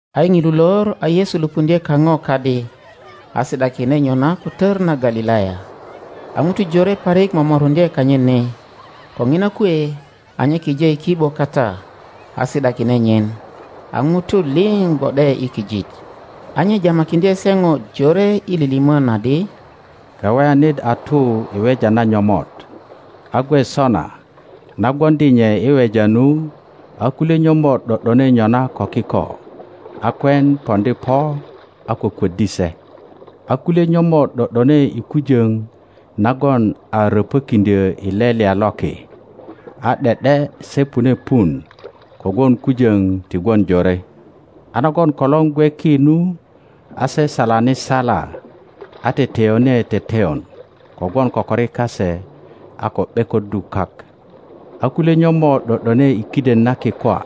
A i ŋilu lor a Yesu lupuŋdye kaŋo kadi, a si ’dakine nyona ko tor na Galilaya. A ŋutu jore parik momoruŋdye kanyit ni, ko ŋina kwe a nye kije i ki ’bo kata a si ’dakine nyin, a ŋutu liŋ gwo ’de i kijit. A nye jamakiŋdye se ŋo jore i lilimon adi, Kaweyanit a tu i weja na nyomot. A gwe sona na gwoŋdi nye i weja nu, a kulye nyomot ’do ’done nyona ko kiko, a kwen poŋdi po a kwökwöddi se. A kulye nyomot ’do ’done i kujoŋ nagon a röpökiŋdyö i lelya loki, a ’de ’de se pune pun kogwon kujoŋ ti gwon jore; a nagon kolor gwe ki nu, a se salani sala, a teteyone teteyon kogwon kokori kase a ko ’bekoddu kak. a kulye nyomot ’do ’done i kiden na kikwa,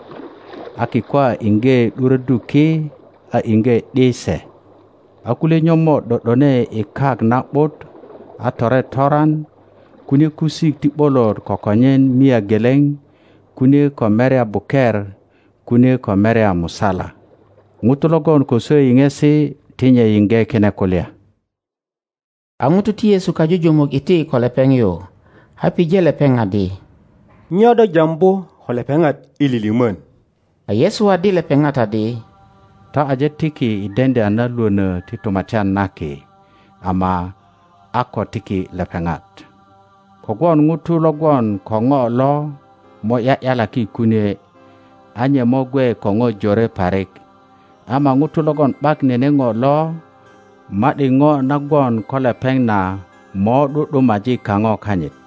a kikwa iŋge ’duroddu ki, a iŋge ’di se. A kulye nyomot ’do ’done i kak na ’but, a tore toran kunie kusik ti ’bolot kokonyen mia geleŋ, kunie ko merya buker, kunie ko merya musala. ŋuto logon ko swo yiŋesi ti nye yiŋge kine kulya. A ŋutu ti Yesu kajujumuk iti ko lepeŋ yu, a pije lepeŋ adi, Nyo do jambu ko lepeŋat i lilimon? A Yesu waddi lepepat adi, Ta aje tiki i deŋdya na Iwono ti Tumatyan na Ki, ama a ko tiki lepeŋat. Kogwon ŋuto lo gwon ko ŋo lo mo ’ya ’yalaki kunie, a nye mo gwe ko ŋo jore parik; ama ŋuto logon ’bak nene ŋo lo, ma ’di ŋo na gwon ko lepeŋ na mo ’du ’dumaji kaŋo kanyit.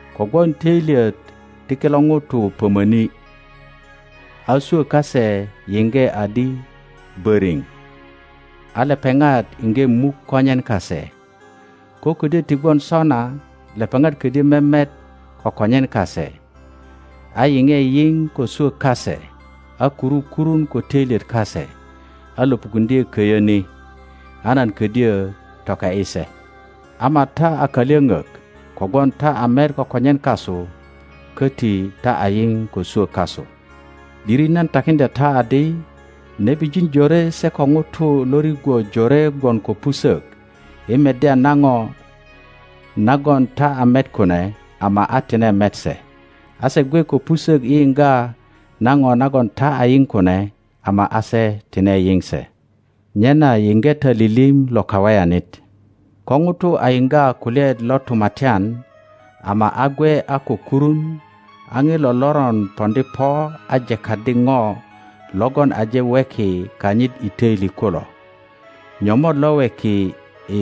kogwon toilyet ti kilo ŋutu pomoni, a swo kase yiŋge adi boriŋ, a lepeŋat iŋge muk konyen kase. Ko kodyö ti gwon sona lepeŋat kodyö memet ko konyen kase, a yiŋe yiŋ ko swo kase, a kuru kurun ko toilyet kase, a lopukuŋdye köyö ni, a nan kodyö toke ’yi se. Ama ta a kalyoŋok kogwon ta a met ko konyen kasu, köti ta a yio ko swo kasu. ’Diri nan takiŋdya ta adi, Nebijin jore se ko ŋutu lo rigwo jore gwon ko pusök i meddya na ŋo nagon ta a met kune, ama a tine met se, a se gwe ko pusok i yiŋga na ŋo nagon ta a yiŋ kune, ama a se tine yiŋ se. Nyena yiŋge ta lilim lo kaweyanit. Ko ŋuto a yiŋga kulyaet lo Tumatyan, ama a gwe a ko kurun, a ŋilo loron poŋdi po a jekaddi ŋo logon aje weki kanyit i töili kulo. Nyomot lo weki i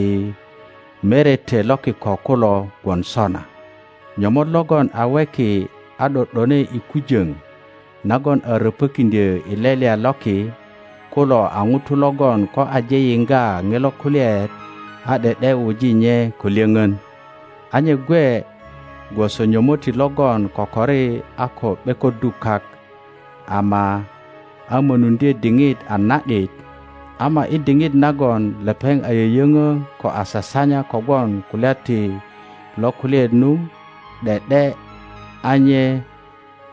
merete lo kiko kulo gwon sona. Nyomot logon a weki a ’do ’done i kujöŋ nagon a röpökiŋdyö i lelya loki kulo a ŋuto logon ko aje yiŋga ŋilo kulyaet a ’de ’de wuji nye ko lyöŋön. A nye gwe gwoso nyomotti logon kokori a ko ’bekoddu kak, ama a mönuŋdye diŋit a na ’dit, ama i diŋit nagon lepeŋ a yöyöŋö ko a sasanya kogwon kulya ti lo kulyaet nu, ’de ’de a nye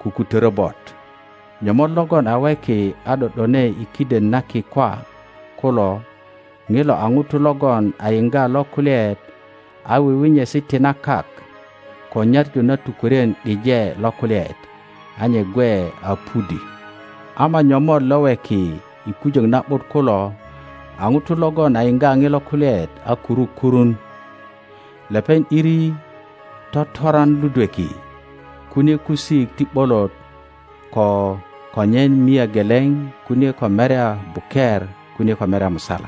kukutorö bot. Nyomot logon a weki a ’do ’done i kiden na kikwa kulo ŋilo a ŋuto logon a yiŋga lo kulyaet, a wiwinyesi ti na kak, ko nyaŋu na tukworien ’deŋ lo kulyaet, a nye gwe a pudi. Ama nyomot lo weki i kujön na ’but kulo a ŋuto logon a yiŋga ŋilo kulyaet a kuru kurun. Lepeŋ ’diri totoran ludweki, kunie kusik ti ’bolot ko konyen mia geleŋ, kunie ko merya buker, kunie ko merya musala.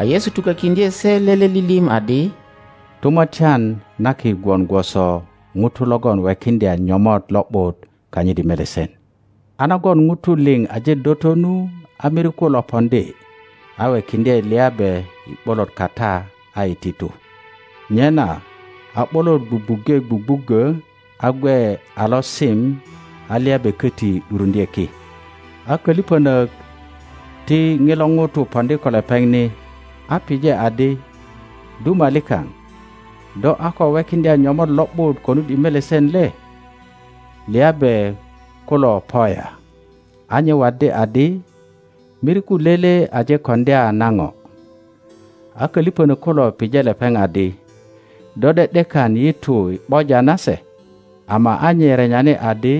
A Yesu tukokiŋdye se lele lilim adi, Tumatyan na Ki gwon gwoso ŋuto logon wekiŋdya nyomot lo ’but kanyit i melesen; a nagon ŋutu liŋ aje doto nu, a miriku lo poŋdi a wekiŋdye liabe i ’bolot kata a iti tu. Nyena a ’bolot gwugwuŋge gwugwuggo, a gwe a losim, a liabe koti ’duruŋdye ki. a köliponok ti ŋilo ŋuto poŋdi ko lepeŋ ni, a pije adi, Duma likaŋ, do a ko wekiŋdya nyomot lo ’but konut i melesen le? Liabe kulo po ya? A nye waddi adi, Miriku lele aje koŋdya na ŋo. A kölipönök kulo pije lepeŋ adi, Do ’de ’dekan yi tu i ’boja na se? Ama a nye renyani adi,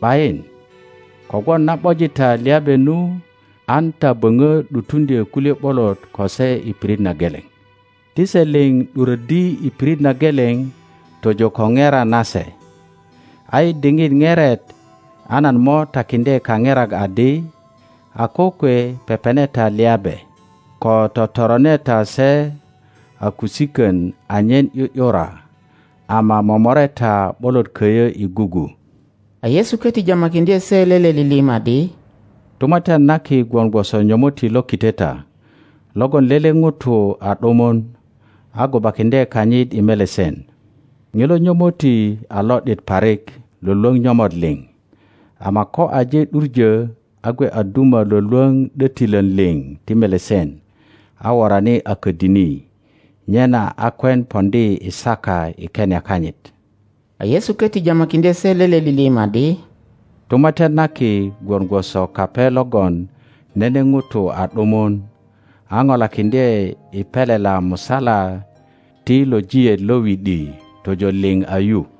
’Bayin, kogwon na ’boji ta liabe nu, an ta böŋo ’dutuŋdyö kulye ’bolot ko se i pirit na geleŋ. Ti se liŋ ’duröddi i pirit na geleŋ tojo ko ŋera nase. A i diŋit ŋeret a nan mo takiŋdye kaŋerak adi, A kokwe pepene ta liabe, ko totorone ta se a kusikön anyen ’yu ’yura, ama momore ta ’bolot köyö i gugu. A Yesu koti jamakiŋdye se lele lilim adi, Tumatyan na Ki gwon gwoso nyomotti lo kiteta logon lele ŋuto a ’dumun, a gubakiŋdye kanyit i melesen; ŋilo nyomotti a lo ’dit parik lwölwöŋ nyomot liŋ, ama ko aje ’duŋö a gwe a duma lwölwöŋ ’dötilön liŋ ti melesen a worani a ködini, nyena a kwen poŋdi i saka i kenia kanyit. A Yesu koti jamakiŋdye se lele lilim adi, Tumatyan na Ki gwon gwoso kape logon nene ŋuto a ’dumun, a polakiŋdye i pelela musala ti lojiet lo wi ’di tojo liŋ a yu.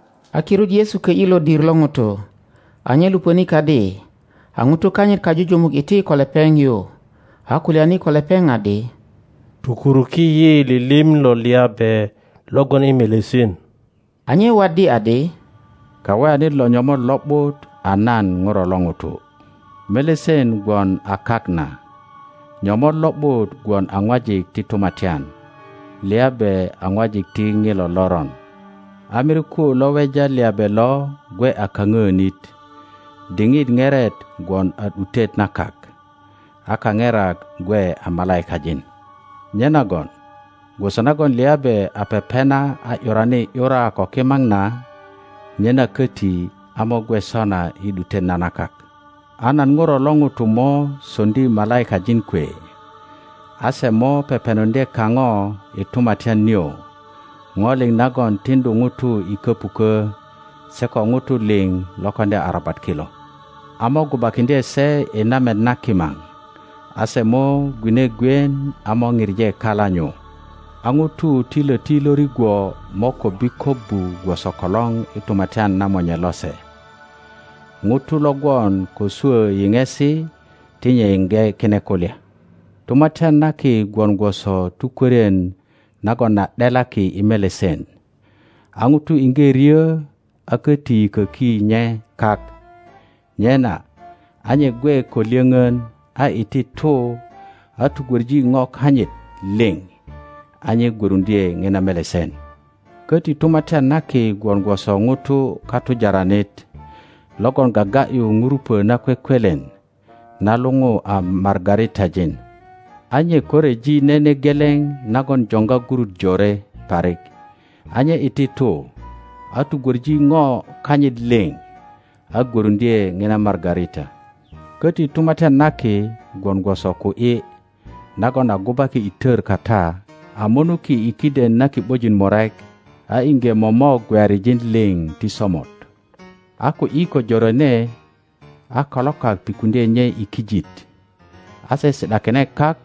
A kirut Yesu kö ’yi lodir lo ŋutu, a nye lupöni kadi; a ŋutu kanyit kajuju muk iti ko lepeŋ yu, a kulyani ko lepeŋ adi, Tokuruki yi lilim lo liabe lo gwon i melesen. A nye waddi adi, Kaweya-nit lo nyomot lo ’but a nan ŋuro lo ŋuto. Melesen gwon a kak na. Nyomot lo ’but gwon a ŋwajik ti Tumatyan; liabe a ŋwajik ti ŋilo loron; a miriku lo weja liabe lo gwe a ka-ŋöönit; diŋit ŋeret gwon a ’dutet na kak; a kaŋerak gwe a malaikajin. Nyenagon gwoso nagon liabe a pepena a ’yurani ’yura ko kimaŋ na, nyena köti a mo gwe sona i ’dutet na na kak. A nan Ŋuro lo ŋuto mo soŋdi malaikajin kwe, a se mo pepenuŋdye kaŋo i Tumatyan nio ŋo liŋ nagon tiŋdu ŋutu i köpukö, se ko ŋutu liŋ lo koŋdya arabat kilo, a mo gubakiŋdye se i namet na kimaŋ; a se mo gwine gwien a mo pije kala nyu. a ŋutu ti loti lo rigwo mo kobbi kobbu gwoso kolor i tumatyan na Monye lose. ŋuto lo gwon ko swö yiŋesi ti nye yiŋge kine kulya. Tumatyan na Ki gwon gwoso tukwörien nagon a ’delaki i melesen. A ŋuto iŋge ryö a köti yiköki nye kak; nyena a nye gwe ko lyöŋon, a iti tu, a tugwoŋi ŋo kanyit liŋ, a nye gwöruŋdye ŋina melesen. Koti Tumatyan na Ki gwon gwoso ŋuto katujaranit logon gaga ’yu ŋurupo nakwekwelen na luŋu a margaritajin. A nye ko ryeji nene geleŋ nagon joŋga gurut jore parik, a nye iti tu, a tugwöŋi ŋo kanyit liŋ, a gwöruŋdye ŋina margarita. Köti Tumatyan na Ki gwon gwoso ku ’yi nagon a gubaki i tor kata a munuki i kiden na ki ’bojin murek, a iŋge momok gweyarijin liŋ ti somot. a ku ’yi ko jorene, a kalokak pikuŋdye nye i kijit, a se si ’dakine kak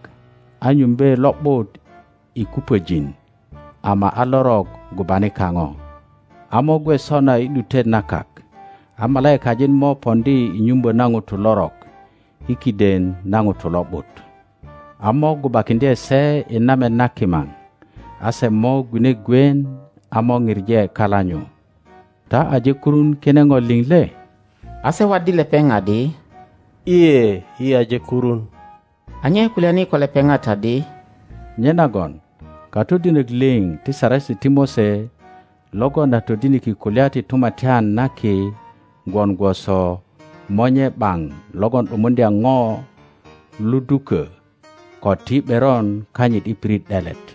a nyumbe lo ’but i kupöjin, ama a lorok gubani kaŋo. A mo gwe sona i ’dutet na kak. A malaikajin mo poŋdi i nyumbo na ŋutu lorok i kiden na ŋutu lo ’but, a mo gubakiŋdye sei namet na kimaŋ; a se mo gwine gwien a mo pije kala nyu. Ta aje kurun kine ŋo liŋ le? A se waddi lepeŋ adi, lye, yi aje kurun. A nye kulyani ko lepeŋat adi, Nyenagon katodinok liŋ ti Saresi ti Mose logon a todiniki kulya ti Tumatyan na Ki gwon gwoso monye ’baŋ logon ’dumuŋdya ŋo ludukö ko ti ’beron kanyit i pirit ’delet.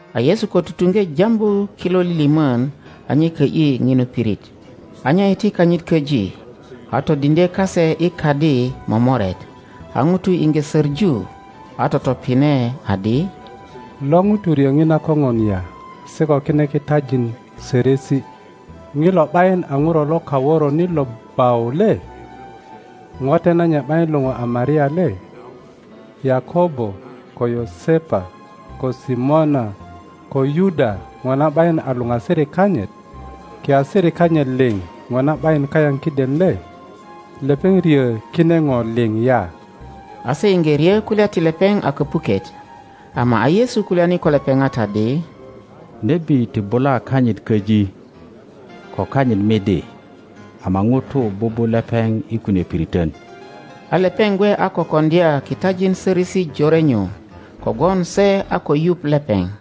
A Yesu ko tutuŋge jambu kilo lilimon a nye kö ’yi ŋinu pirit. a nye iti kanyit köji, a todiŋdye kase i kadi momoret, a ŋutu iŋge soŋu, a totopine adi, Lo ŋuto ryo ŋina koŋon ya se ko kine kitajin sorosi? ŋilo ’bayin a ŋuro lo kaworonit lo bau le? Ŋote nanyit ’bayin luŋu a Maria le? Yakobo ko Yosepa ko Simona ko Yuda ŋona ’bayin a luŋasirik kanyit? Kiasirik kanyit liŋ ŋona ’bayin kayaŋ kiden le? Lepeŋ ryö kine ŋo liŋ ya? A se iŋge ryo kulya ti lepeŋ a kopuket. Ama a Yesu kulyani ko lepeŋat adi, Nebi ti bula kanyit köji, ko kanyit midi, ama ŋutu bubu lepeŋ i kunie piriton. A lepeŋ gwe a ko koŋdya kitajin sorosi jore nyu kogwon se a ko yuŋ lepeŋ.